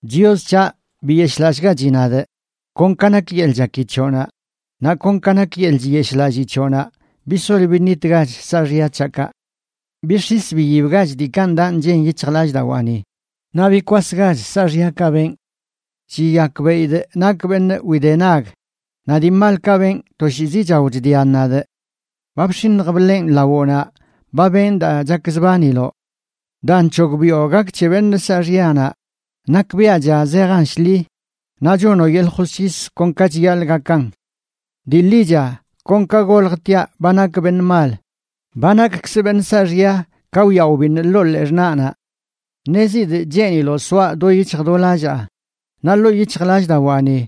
Chios c̱haꞌ, biyeshꞌlallꞌgachi nadꞌ, kon ka nak yeḻꞌ chaki c̱hoꞌnaꞌ; naꞌ kon ka nak yeḻꞌ chiyeshꞌlallii c̱hoꞌnaꞌ, bisol biṉitgach saaxya c̱haꞌkaꞌ. Bix̱is biyibgach diikaꞌ ndaꞌ nchen yic̱hjlallꞌdawaani, naꞌ bikwasgach saaxyakaꞌ benꞌ. Chiyakbeꞌidꞌ nakꞌ beṉꞌ widenag, naꞌ dii malkaꞌ benꞌ toshiizi chao chdian nadꞌ. Ba bx̱iṉj bḻenꞌ lawoꞌnaꞌ; ba benꞌ daa chakzbaniloꞌ. Daa nc̱hogbiꞌo gak c̱he beṉꞌ saaxyanaꞌ nakbiaꞌcha zejan shḻi, naꞌ chonoꞌ yeḻꞌ josc̱his kon ka chiyaḻꞌ gakan. Dii ḻicha kon ka goljtiaꞌ ba nakꞌ beṉꞌ mal; ba nakkzꞌ beṉꞌ saaxya ka wyaꞌ wbiṉꞌ ḻoo ḻee xṉaꞌnaꞌ. Ṉezidꞌ cheeniloꞌ soaꞌ do yic̱hj do lallaa, naꞌ ḻoo yic̱hjlallꞌdawaani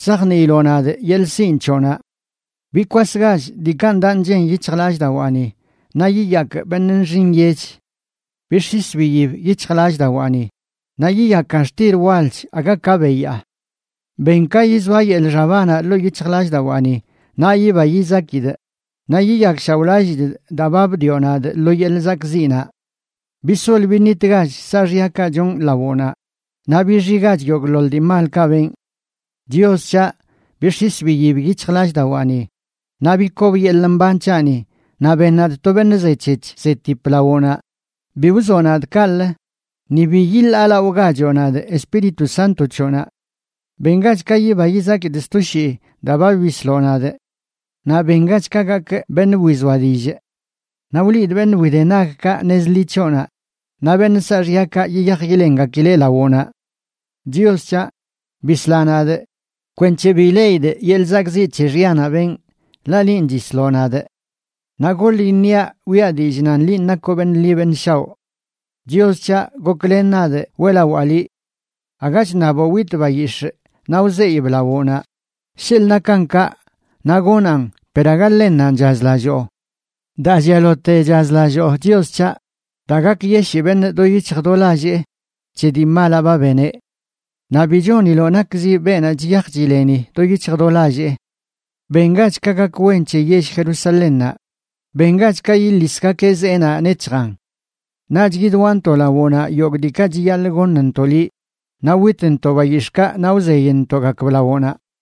chzajniiloꞌ nadꞌ yeḻꞌ sinꞌ c̱hoꞌnaꞌ. Bikwasgach diikaꞌ ndaꞌ nchen yic̱hjlallꞌdawaani, naꞌ yiyakꞌ beṉꞌ nxi nyech. Bix̱is biyib yic̱hjlallꞌdawaani, naꞌ yiyakan xtil walch aga ka beyaa. Ben ka yizoa yeḻꞌ xabanaꞌ ḻoo yic̱hjlallꞌdawaani, naꞌ yiba yizakidꞌ; naꞌ yiyakshaoꞌlallidꞌ daa ba bdioꞌ nadꞌ lo yeḻꞌ zakꞌziꞌnaꞌ. Bisol biṉitgach saaxyakaꞌ chonꞌ lawoꞌnaꞌ, naꞌ bixigach yogꞌḻoḻ dii malkaꞌ benꞌ. Chios c̱haꞌ, bix̱is biyib yic̱hjlallꞌdawaani, naꞌ bikob yeḻꞌ mban c̱haꞌni, naꞌ ben nadꞌ to beṉꞌ zec̱hec̱h zetip lawoꞌnaꞌ. Bi wzoꞌ nadꞌ kaꞌlə, ni bi yiḻaalaꞌogachoꞌ nadꞌ Espíritu Sánto c̱hoꞌnaꞌ. Bengach ka yiba yizakidꞌ sto shii daa ba bisloꞌ nadꞌ; naꞌ bengach ka gakꞌ beṉꞌ wizoa dillꞌ. Naꞌ wliidꞌ beṉꞌ widenagkaꞌ nez ḻi c̱hoꞌnaꞌ naꞌ beṉꞌ saaxyakaꞌ yiyaj yilengakileꞌ lawoꞌnaꞌ. Chios c̱haꞌ, bisla nadꞌ kwenc̱he bi ileꞌidꞌ yeḻꞌ zakꞌziꞌ c̱he xyanaꞌ benꞌ, ḻaꞌ linꞌ chisloꞌ nadꞌ. Naꞌ goḻ iṉiaꞌ wiꞌa dillꞌ nan liꞌ nakoꞌ beṉꞌ ḻi beṉꞌ shaoꞌ. Chios c̱haꞌ, goklen nadꞌ weꞌlawaa liꞌ. Aga chṉaboꞌ witꞌ bayix̱ꞌ naꞌ wzeyꞌb lawoꞌnaꞌ; sheḻꞌ nakan kaꞌ, naꞌ gonaꞌn, per aga ḻennanꞌ chazlalloo. Daa llialote chazlalloo, Chios c̱haꞌ, daa gakyeshii beṉꞌ do yic̱hj do lallee c̱he dii malaꞌ ba beneꞌ. Naꞌ bi choniloꞌ nakzi beenaꞌ chiyaj chileni do yic̱hj do lallee. Bengach ka gak wen c̱he yell Jerusalénnaꞌ, bengach ka yiḻisgakeꞌ zeenaꞌ nec̱hjan. Naꞌch yidwaꞌntoꞌ lawoꞌnaꞌ yogꞌ diikaꞌ chiyaḻꞌ goṉntoꞌ liꞌ, naꞌ witntoꞌ bayix̱ꞌkaꞌ naꞌ wzeyꞌntoꞌgakb lawoꞌnaꞌ.